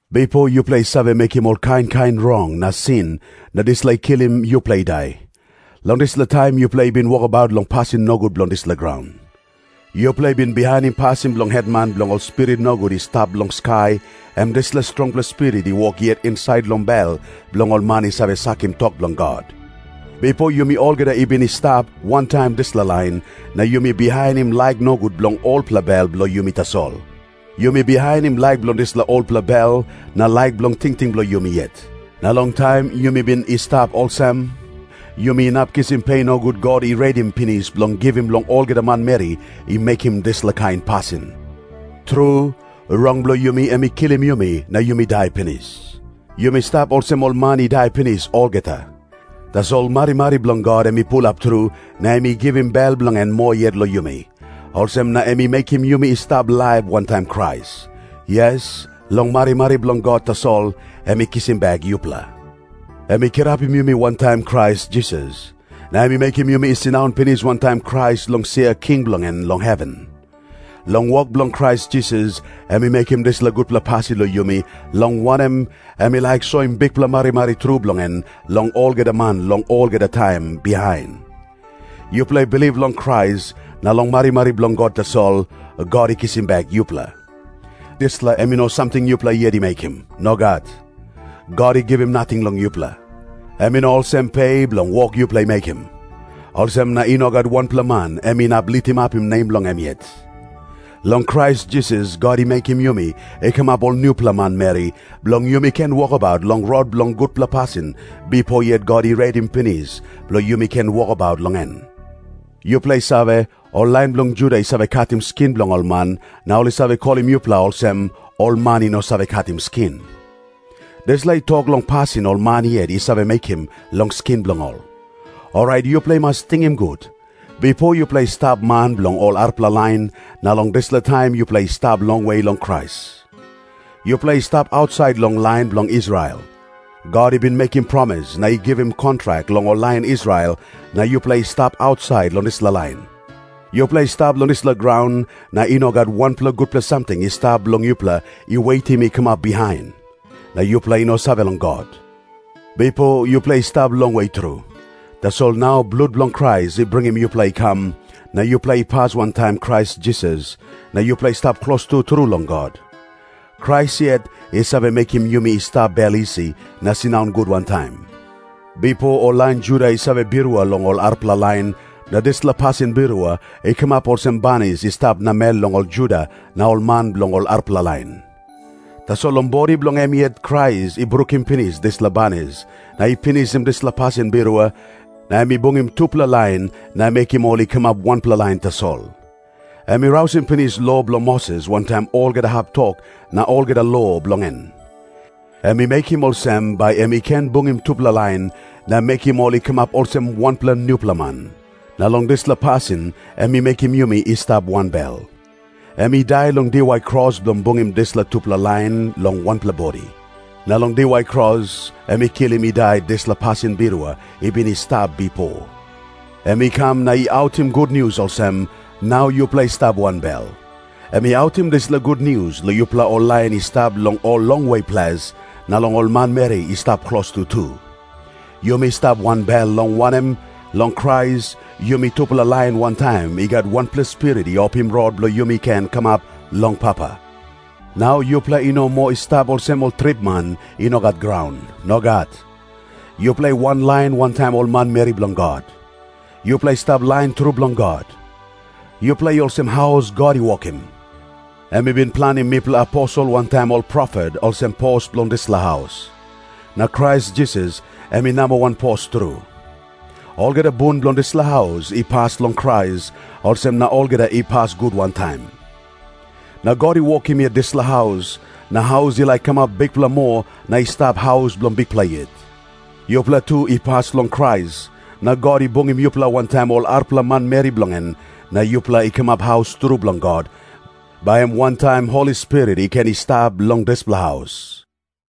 Bipo yupela i save mekim ol kain kain rong na sin, na dispela i kilim yupela i dai. Long dispela taim yupela i bin wokabaut long pasin nogut bilong dispela graun. Yupela i bin bihainim pasin bilong hetman bilong ol spirit nogut i stap long skai, em dispela strongpela spirit i wok yet insait long bel bilong ol man i save sakim tok bilong God. Bipo yumi olgeta i bin i stap wantaim dispela lain, na yumi bihainim laik nogut bilong olpela bel bilong yumi tasol. Yumi bihainim laik bilong dispela olpela bel na laik bilong tingting bilong yumi yet. Na long taim yumi bin i stap olsem, yumi inap kisim pe nogut God i redim pinis bilong givim long olgeta manmeri i mekim dispela kain pasin. Tru, rong bilong yumi em i kilim yumi na yumi dai pinis. Yumi stap olsem ol man i dai pinis olgeta. Tasol marimari bilong God em i pulap tru na em i givim bel bilong en moa yet long yumi. Olsem na em i mekim yumi i stap laip wantaim Krais. Yes, long marimari bilong God tasol em i kisim bek yupela. Em i kirapim yumi wantaim Krais Jisas. Na em i mekim yumi i sindaun pinis wantaim Krais long sia king bilong en long heven. Long wok bilong Krais Jisas em i mekim dispela gutpela pasin long yumi, long wanem, em i laik soim bikpela marimari tru bilong en long olgeta man long olgeta taim bihain. Yupela i bilip long Krais, na long marimari bilong God tasol, God i kisim bek yupela. Dispela em i no samting yupela yet i mekim. Nogat. God i givim nating long yupela. Em i no olsem pe bilong wok yupela i mekim. Olsem na i no gat wanpela man em inap litimapim nem bilong em yet. Long Krais Jisas God i mekim yumi i kamap ol nupela manmeri, bilong yumi ken wokabaut long rot bilong gutpela pasin bipo yet God i redim pinis bilong yumi ken wokabaut long en. Yupela i save, ol lain bilong Juda i save katim skin bilong ol man, na ol i save kolim yupela olsem, “Ol man i no save katim skin.” Dispela i tok long pasin ol man yet i save mekim long skin bilong ol. Orait yupela i mas tingim gut, bipo yupela i stap man bilong ol arapela lain, na long dispela taim yupela i stap longwe long Krais. Yupela i stap ausait long lain bilong Israel. God i bin mekim promis na i givim kontrak long ol lain Israel, na yupela i stap ausait long dispela lain. Yupela i stap long dispela graun, na i no gat wanpela gutpela samting i stap bilong yupela i wetim i kamap bihain. Na yupela i no save long God. Bipo yupela i stap longwe tru. Tasol nau blut bilong Krais i bringim yupela i kam, na yupela i pas wantaim Krais Jisas na yupela i stap klostu tru long God. Krais yet i save mekim yumi i stap bel isi na sindaun gut wantaim. Bipo ol lain Juda i save birua long ol arapela lain, na dispela pasin birua i kamap olsem banis i stap namel long ol Juda na ol man bilong ol arapela lain. Tasol long bodi bilong em yet Krais i brukim pinis dispela banis na i pinisim dispela pasin birua, na em i bungim tupela lain na mekim ol i kamap wanpela lain tasol. Em i rausim pinis lo bilong Moses wantaim olgeta hap tok na olgeta lo bilong en. Em i mekim olsem, bai em i ken bungim tupela lain na mekim ol i kamap olsem wanpela nupela man. Na long dispela pasin em i mekim yumi i stap wanbel. Em i dai long diwai kros bilong bungim dispela tupela lain long wanpela bodi. Na long diwai kros em i kilim i dai dispela pasin birua i bin i stap bipo. Em i kam na i autim gutnius olsem, “Nau yupela i stap wanbel.” Em i autim dispela gutnius long yupela ol lain i stap long ol longwe ples, na long ol manmeri i stap klostu tu. Yumi stap wanbel, long wanem, long Krais yumi tupela lain wantaim i gat wanpela Spirit i opim rot bilong yumi ken kamap long Papa. Nau yupela i no moa i stap olsem ol tripman i no gat graun. Nogat. Yupela i wanlain wantaim ol manmeri bilong God. Yupela i stap lain tru bilong God. Yupela i olsem haus God i wokim. Em i bin planim mipela aposel wantaim ol profet olsem pos bilong dispela haus. Na Krais Jisas em i namba wan pos tru. Olgeta bun bilong dispela haus i pas long Krais, olsem na olgeta i pas gut wantaim. Na God i wokim yet dispela haus, na haus i laik kamap bikpela moa na i stap haus bilong Bikpela yet. Yupela tu i pas long Krais, na God i bungim yupela wantaim ol arapela manmeri bilong en, na yupela i kamap haus tru bilong God, bai em wantaim Holi Spirit i ken i stap long dispela haus.